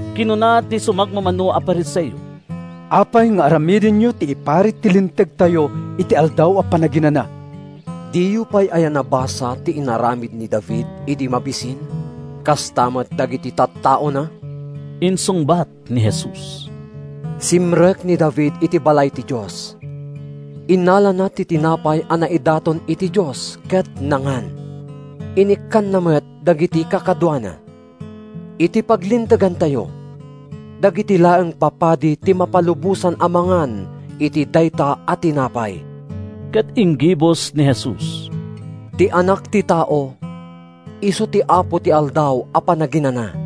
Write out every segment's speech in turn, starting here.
Kinuna ti sumagmamano a Fariseo, “Apay nga aramidenyo ti iparit ti Lintegtayo iti Aldaw a Panaginana?” “Diyo pay aya nabasa ti inaramid ni David idi mabisin, kasta met dagiti tattaona?” insungbat ni Jesus. “Simrek ni David iti balay ti Dios, innalana ti tinapay a naidaton iti Dios ket nangan. Inikkanna met dagiti kakaduana. Iti paglintegantayo, dagiti laeng papadi ti mapalubosan a mangan iti dayta a tinapay.” Ket inggibus ni Jesus, “Ti Anak ti Tao isu ti Apo ti Aldaw a Panaginana.”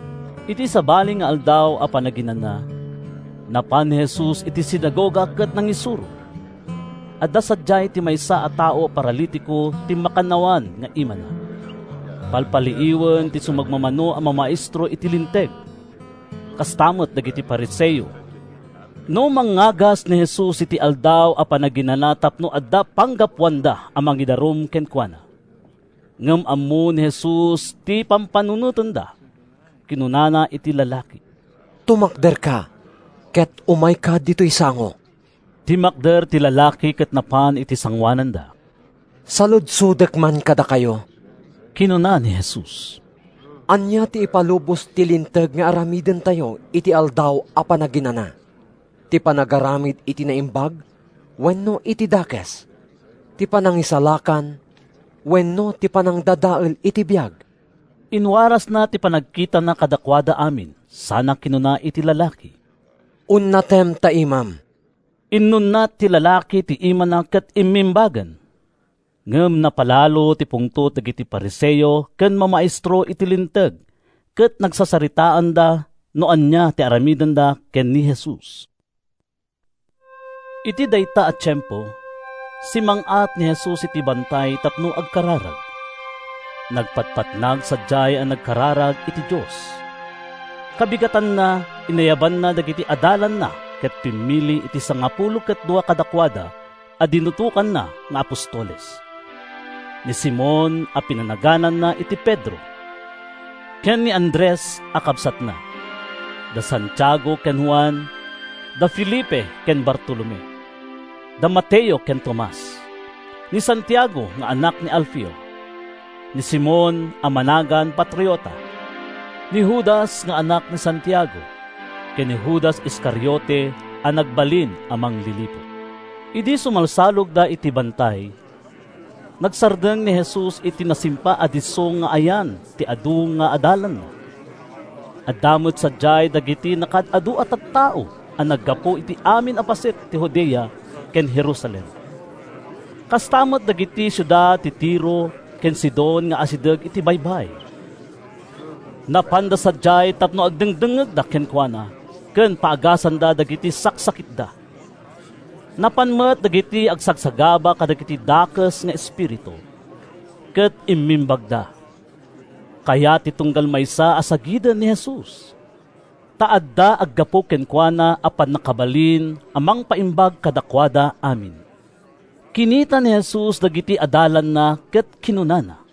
Iti sabali nga Aldaw a Panaginana, napan ni Jesus iti sinagoga ket nangisuro. Adda sadiay ti maysa a tao a paralitiko ti makannawan nga imana. Palpaliiwen ti sumagmamano a mamaestro iti Linteg, kasta met dagiti Fariseo, no mangagas ni Jesus iti Aldaw a Panaginana tapno adda panggapuanda a mangidarum kenkuana. Ngem ammo ni Jesus ti pampanunotenda. Kinunana iti lalaki, “Tumakderka ket umayka ditoy sango.” Timmakder ti lalaki ket napan iti sangoananda. “Saludsodek man kadakayo,” kinuna ni Jesus. “Ania ti ipalubos ti Linteg nga aramidentayo iti Aldaw a Panaginana: ti panagaramid iti naimbag wenno iti dakes? Ti panangisalakan wenno ti panangdadael iti biag?” Inwarasna ti panagkitana kadakuada amin sana kinuna iti lalaki, “Unnatem ta imam.” Inunnat ti lalaki ti imana ket immimbagen. Ngem napalalo ti pungtot dagiti Fariseo ken mamaestro iti Linteg ket nagsasaritaanda no ania ti aramidenda ken ni Jesus. Iti dayta a tiempo, simmang-at ni Jesus iti bantay tapno agkararag. Nagpatpatnag sadiay a nagkararag iti Dios. Kabigatanna, inayabanna dagiti adalanna ket pimmili iti sangapulo ket dua kadakuada a dinutokanna nga apostoles: ni Simon (a pinanagananna iti Pedro) ken ni Andres a kabsatna, da Santiago ken Juan, da Felipe ken Bartolome, da Mateo ken Tomas, ni Santiago nga anak ni Alfeo, ni Simon (a managan Patriota), ni Judas nga anak ni Santiago ken ni Judas Iscariote a nagbalin a mangliliput. Idi sumalsalogda iti bantay, nagsardeng ni Jesus iti nasimpa a disso nga ayan ti adu nga adalanna. Adda met sadiay dagiti nakaad-adu a tattao a naggapu iti amin a paset ti Judea ken Jerusalem, kasta met kadagiti siudad ti Tiro ken Sidon nga asideg iti baybay. Napanda sadiay tapno agdengngegda kenkuana ken paagasanda dagiti saksakitda. Napan met dagiti agsagsagaba kadagiti dakes nga espiritu, ket immimbagda. Kayat ti tunggal maysa a sagiden ni Jesus, ta adda aggapu kenkuana a pannakabalin a mangpaimbag kadakuada amin. Kinita ni Jesus dagiti adalanna ket kinunana: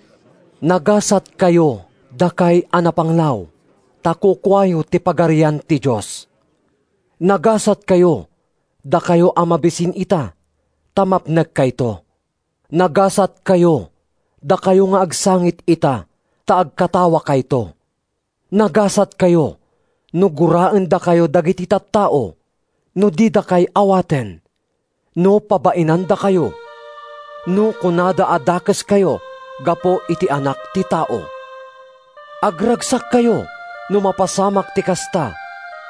“Nagasatkayo, dakay a napanglaw, ta kukuayo ti Pagarian ti Dios! “Nagasatkayo, dakayo a mabisin ita, ta mapnekkayto! “Nagasatkayo, dakayo nga agsangit ita, ta agkatawakayto! “Nagasatkayo no guraendakayo dagiti tattao, no didakay awaten, no pabainandakayo, no kunada a dakeskayo, gapu iti Anak ti Tao! Agragsakkayo no mapasamak ti kasta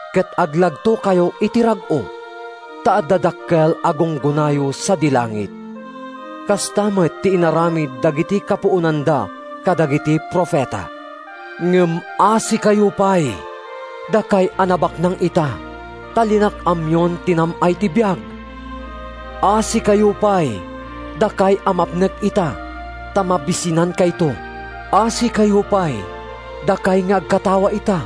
ket aglagtokayo iti rag-o, ta adda dakkel a gunggonayo sadi langit. Kasta met ti inaramid dagiti kapuonanda kadagiti profeta. “Ngem asikayo pay, dakay a nabaknang ita, ta linak-amyon ti nam-ay ti biag! “Asikayo pay, dakay a mapnek ita, ta mabisinankayto! “Asikayo pay, dakay nga agkatawa ita,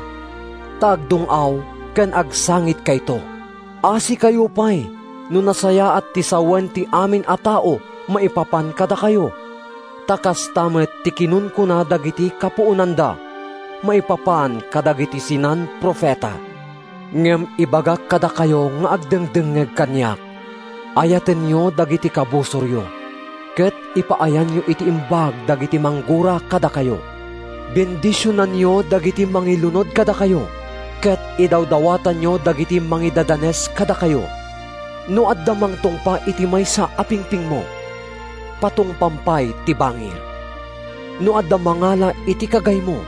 ta agdung-aw ken agsangitkayto! “Asikayo pay no nasayaat ti sawen ti amin a tao maipapan kadakayo; ta kasta met ti kinunkuna dagiti kapuonanda maipapan kadagiti sinan-profeta.” “Ngem ibagak kadakayo nga agdengdengngeg kaniak: Ayatenyo dagiti kabusoryo ket ipaayanyo iti imbag dagiti manggura kadakayo. Bendisionanyo dagiti mangilunod kadakayo ket idawdawatanyo dagiti mangidadanes kadakayo. No adda mangtungpa iti maysa a pingpingmo, patungpam pay ti bangir. No adda mangala iti kagaymo,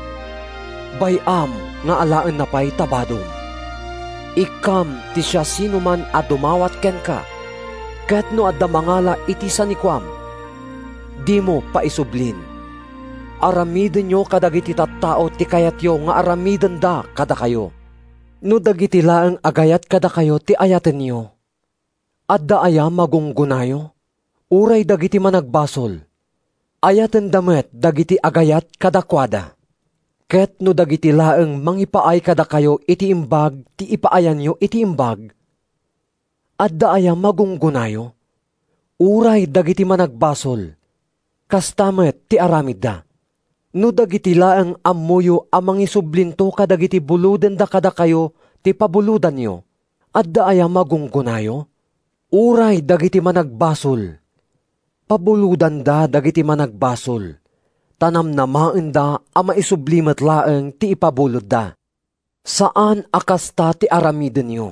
bay-am nga alaenna pay ta badom. Ikkam ti siasinoman a dumawat kenka, ket no adda mangala iti sanikuam, dimo paisublin. Aramidenyo kadagiti tattao ti kayatyo nga aramidenda kadakayo. “No dagiti laeng agayat kadakayo ti ayatenyo, adda aya magunggonayo? Uray dagiti managbasol, ayatenda met dagiti agayat kadakuada. Ket no dagiti laeng mangipaay kadakayo iti imbag ti ipaayanyo iti imbag, adda aya magunggonayo? Uray dagiti managbasol, kasta met ti aramidda! No dagiti laeng ammoyo a mangisublinto kadagiti bulodenda kadakayo ti pabulodanyo, adda aya magunggonayo? Uray dagiti managbasol pabulodanda dagiti managbasol ta namnamaenda a maisubli met laeng ti ipabulodda. Saan a kasta ti aramidenyo!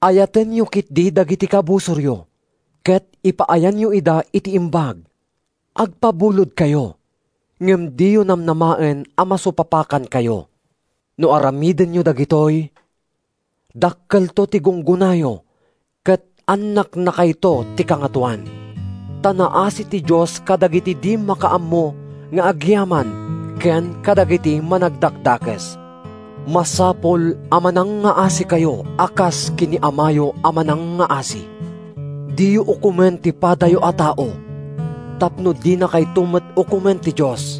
Ayatenyo ketdi dagiti kabusoryo ket ipaayanyo ida iti imbag. Agpabulodkayo, ngem diyo namnamaen a masupapakankayo. No aramidenyo dagitoy, dakkelto ti gunggonayo ket annaknakayto ti Kangatoan. Ta naasi ti Dios kadagiti di makaammo nga agyaman ken kadagiti managdakdakes. Masapul a manangngaasikayo a kas ken ni Amayo a manangngaasi.” “Diyo ukomen ti padayo a tao tapno dinakayto met ukomen ti Dios.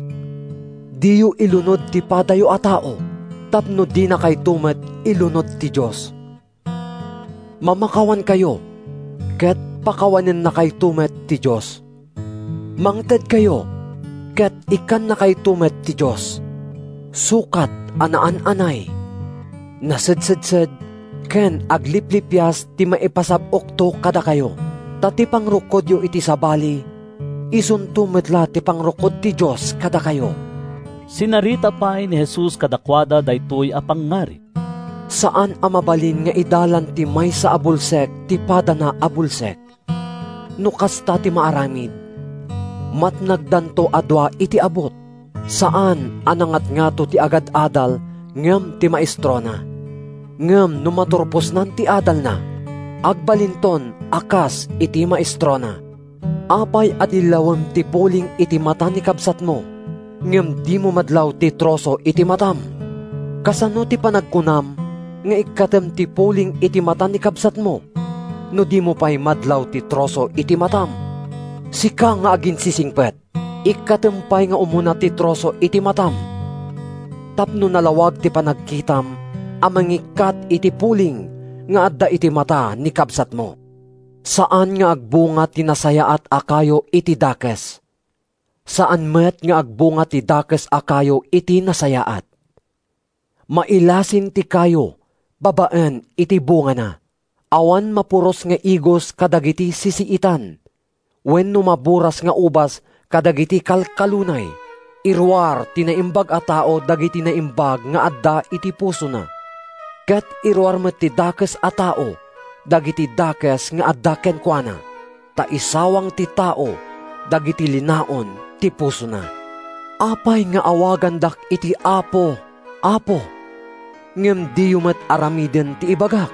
Diyo ilunod ti padayo a tao tapno dinakayto met ilunod ti Dios. Mamakawankayo ket pakawanennakayto met ti Dios. Mangtedkayo ket ikkannakayto met ti Dios: sukat a naan-anay, nasedsed ken agliplipias ti maipasab-okto kadakayo. Ta ti pangrukodyo iti sabali isunto met la ti pangrukod ti Dios kadakayo.” Sinarita pay ni Jesus kadakuada daytoy a pangngarig: “Saan a mabalin nga idalan ti maysa a bulsek ti padana a bulsek. No kasta ti maaramid, matnagdanto a dua iti abut. Saan a nangatngato ti agad-adal ngem ti maestrona. Ngem no maturposnan ti adalna, agbalinton a kas iti maestrona. “Apay a dillawem ti puling iti mata ni kabsatmo ngem dimo madlaw ti troso iti matam? Kasano ti panagkunam nga ikkatem ti puling iti mata ni kabsatmo no dimo pay madlaw ti troso iti matam? Sika nga aginsisingpet! Ikkatem pay nga umuna ti troso iti matam, tapno nalawag ti panagkitam a mangikkat iti puling nga adda iti mata ni kabsatmo.” “Saan nga agbunga ti nasayaat a kayo iti dakes. Saan met nga agbunga ti dakes a kayo iti nasayaat. Mailasin ti kayo babaen iti bungana. Awan mapuros nga igos kadagiti sisiitan, wenno maburas nga ubas kadagiti kalkalunay. Iruar ti naimbag a tao dagiti naimbag nga adda iti pusona, ket iruar met ti dakes a tao dagiti dakes nga adda kenkuana. Ta isawang ti tao dagiti linaon ti pusona.” “Apay nga awagandak iti ‘Apo, Apo,’ ngem diyo met aramiden ti ibagak?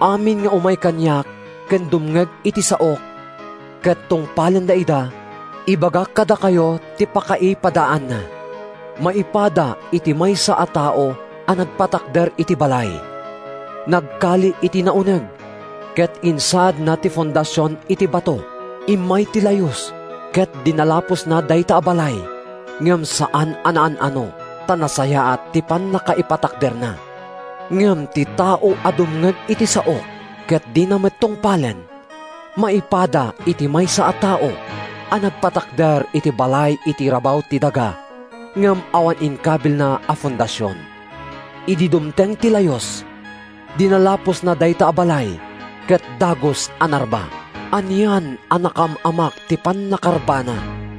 Amin nga umay kaniak ken dumngeg iti saok, ket tungpalenna ida—ibagak kadakayo ti pakaipadaanna. Maipada iti maysa a tao a nagpatakder iti balay. Nagkali iti nauneg ket insaadna ti fondasion iti bato. Immay ti layus ket dinalapusna dayta a balay, ngem saan a naan-ano ta nasayaat ti pannakaipatakderna. Ngem ti tao a dumngeg iti saok ket dina met tungpalen, maipada iti maysa a tao a nagpatakder iti balay iti rabaw ti daga ngem awan inkabilna a fondasion. Idi dumteng ti layus, dinalapusna dayta a balay ket dagus a narba. Anian a nakaam-amak ti pannakarbana!”